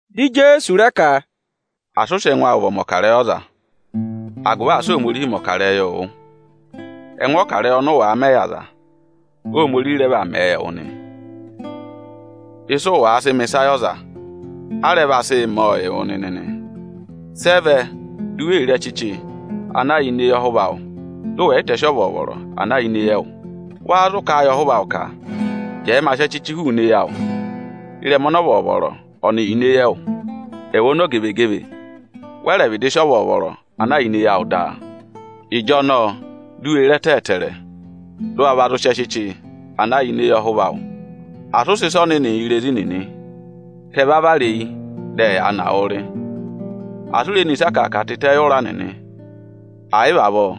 Dị Ijeesu rẹ ka, “Asị ụ sị ẹngụ awụ vị ọmọkarẹyị ọza, agụvị asị Ohomorihi mẹ̀ ọkarẹyị wụ! Ẹngụ ọkarẹyị ọnị ụ wàa mẹ yị aza, Ohomorihi rẹ vaa mẹẹ yị ẹwụ nị. Ịsị ụ wàa sị mọ ịsa yị ọza, a rẹ vaa sị mọọ yị wụ nịnị nị. Sị ẹ vẹ di u wee re ẹchịchị ana yà ini eyi ọhụva awụ, dị ụ wẹ̀ yị tẹsị ọvọọvọrọ ana yà ịnị ẹ́ẹwụ? Wâ zụ kà a yị ọhụva awụ ka: ‘Jẹẹ ma sị ẹchịchị hụụnị eyi awụụ wụ,’ ịrẹma ọnọ ọvọọvọrọ ọnị yà ini eyi ẹwụ? Ẹwụ ọmọzakụyẹ, wẹ rẹ̀ vịdị sị ọvọọvọrọ ana yà ini eyi awụ daa! Ịjọnọọ di u wee re ẹtẹ ẹtẹẹrẹ, dị ụ wa va zụ sị ẹchịchị ana yà ini eyi ọhụva awụ. Asị ụ sị ịsa ọnịnị yị irezi nịnị, ka ẹ va vara eyi, dị ẹyaa na wụụ rị! Asị u re ne ịsa akàaka tịtẹ yị ụ̀rá nịnị, ẹ̀ yị vị avọọ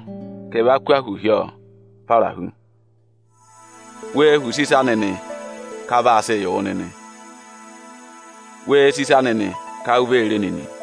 ka ẹ va kụ́ ahụ hi ọ para hu.” “Wee họ̀ use ịsa nịnị ka a vaa sịị yị wụ nịnị! Wee sì ịsa nịnị ka u vee re e nịnị!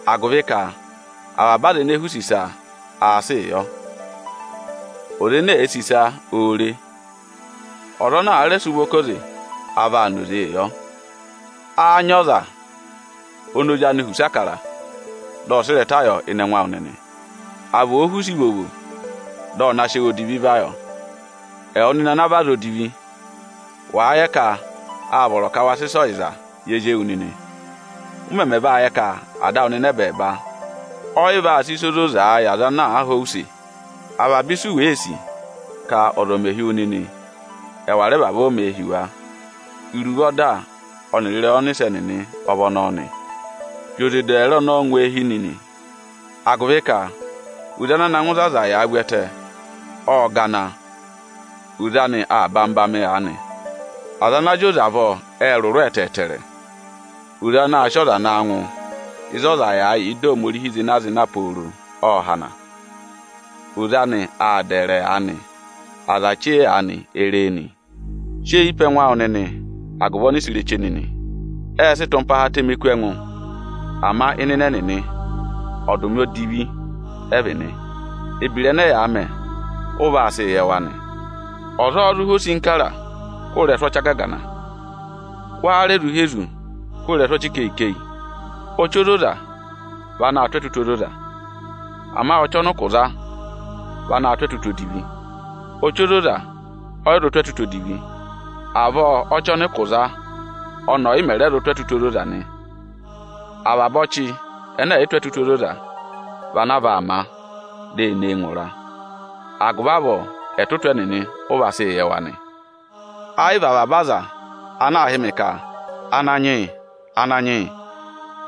Agụvị ka avaba aza ene èe họ̀ use ịsa, aā sịị yị wa. Ọza ene èe sì ịsa, oō re e; ọza ana àa rẹ sị ụvọ ká oze, a vaa na oze yọ. Áá nyị ọza oni ozi anị họ̀ use Ịbụrẹẹdị, dị ọ sị ịrẹta yọ ịnị ẹngụ awụ nịnị; à vị òo họ̀ use ivovo, dị ọ na sị ẹwụ odivi va yọ? Ẹwụ nịnị ana vị aza edivi, wàa yẹ ka áa vọrọ ka wa sị ịsa ọyịza yị ezi ewu nịnị; ụ mẹmẹ va yẹ ka Ada awụ nịnị ẹbẹẹba ọ yị vaa sị ịsa ozoza yị aza ana aa họ̀ ọ use? Avaba ịsị u wèe sì ka ọza ọ̀ mẹ hi wu nịnị, ẹwà rẹ vavọọ mẹ̀ ẹ hi wa! Iruvo ọda ọnịrị ịrẹyị ọnịsẹ nịnị ọ vị ọnọọ nị.” “Zị oze dẹẹrẹ ọnọọ ngụ eehi nịnị! Agụvị ka oze ana na ngụ ịzị aza yàā vu ẹtẹ, ộ gana, oze anị aa ba mị ba mị aanị. Aza ana zị oze avọọ ệ rụrụ ẹtẹẹtẹrẹ. Oze ana aa sị ọza naa ngụ ịzị ọza yàā yà ịda Ohomorihi pooro zịna-zịna, ộ hana, oze anị aa dẹẹrẹ aanị. Aza chee aanị e ree nị.” “Sị eyi pe ẹngụ awụ nịnị agụvị ọnịsẹ ireche nịnị. Ẹẹ̄ sị ịtụmpaha atẹmẹẹ kú ẹngụ, ama ịnịnẹ ẹnịnị, akatapooro odivi ẹ vị nị. Ebira ẹnẹ ẹyaa mẹ, ụ vaa sị yẹ wa nị. Ọza ọ́ọ́ zụ há osinkara hụrẹ ịrẹsụ ọchị agagana? Wáá rẹ zụ há ezu hụrẹ ịrẹsụ ọchị ikeyi-ikeyi? Ọchị ozoza vị anaā tụ́ ẹtụtụ ozoza. Ama ọchị ọnị ụkụ za vị anaā tụ́ ẹtụtụ odivi. Ọchị ozoza ọ yị zụ tụ́ ẹtụtụ odivi, avọọ ọchị ọnị ụkụ za ọnị ọ̀ yị mẹ̀ rẹ zụ tụ́ ẹtụtụ ozoza nị. Avaba ọchị ẹnẹ ẹ̀ yị tụ́ ẹtụtụ ozoza vị anaa vaa má, di e nee ngụ ịra. Agụvị avọọ ẹtụtụ ẹnịnị, ụ vaa sị yẹ wa nị.” “Ẹ yị vị avaba aza ana aa hị́ mị ka: ‘Ananyị yị!’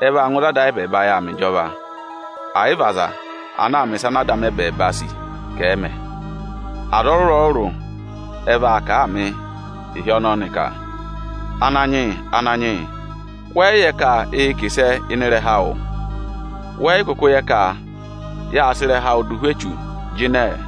ẹ vaa ngụ ịzị Ada ayị ẹbẹẹba yà aa mẹ ịjọva; ẹ̀ yị vị aza ana aa mẹ̀ ịsa ana Ada amị ẹbẹẹba sì ka ẹ̀ mẹ. Aza ọrụrụ-ọrụrụ ẹ vaa kà a mị ịhị ọnọọ nị ka: ‘Ananyị yị, Ananyị yị.’ Wẹ yị yẹ ka ịị̄ sị ịrẹha awụụ kà ịsẹẹ? Wẹ yị kụkụ yẹ ka yâ sị ịrẹha awụ dụ ụhwẹ echu jịnẹẹ?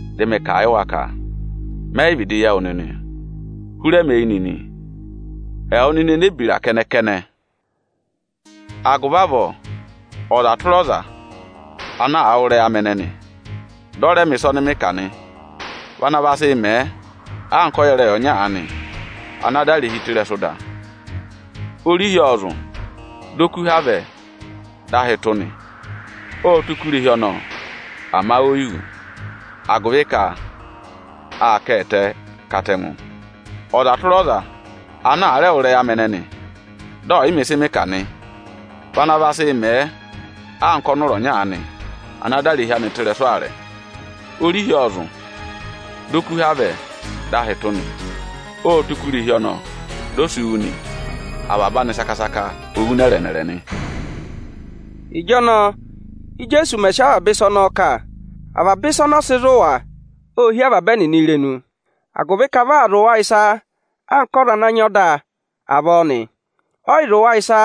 Dị mị kà a yị wa ka: ‘Mẹ yị vịdị yẹ wụ nịnị; hụrẹ mi eyi nịnị, ẹwụ nịnị enebira kẹnẹ-kẹnẹ!’” “Agụvị avọọ ọza tụra ọza ana àa wụ́ ịrẹyị amị ẹnẹnị, dị ọ rẹ mẹ̀ ịsa ọnị mị kà nị, vị ana vaa sị mẹẹ anka ọyẹrẹyị ọnya aanị ana dà irehi anị tụ́ ịrẹsụ ịda. Orihi ộ zụ̀, dị okuha vẹ, dị ahị tụ́ nị. Ộ tụ́ kú irehi ọnọọ, ama oyi wú; agụvị ka â dà a tụ́ ịrẹsụ ịda. Ọza tụra ọza ana àa rẹ wụ́ ịrẹyị amị ẹnẹnị dị ọ̀ yị mẹ ịsị mị kà nị, vị ana vaa sị mẹẹ anka ọnụra ọnya aanị ana dà irehi anị tụ́ ịrẹsụ aarẹ. Orihi ộ zụ̀, dị okuha vẹ, dị ahị tụ́ nị. Ộ tụ́ kú irehi ọnọọ, di o si wú nị. Avaba anị saka-saka o wú nẹrẹ-nẹrẹ nị.” Ịjọnọọ Íjeesu mẹ̀ sị avaba ịsa ọnọọ kà, avaba ịsa ọnọọ sị zụ̀ wa, ô hí avaba ẹnịnị irenu. Agụvị ka vị aa zụ̀ wa ịsa anka ọza ana nyị ọda avọọ nị; ọ yị zụ̀ wa ịsa,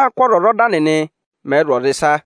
anka ọ́zwọzọda nịnị mẹ̀ẹ̄ zụ̀ ọza ịsa.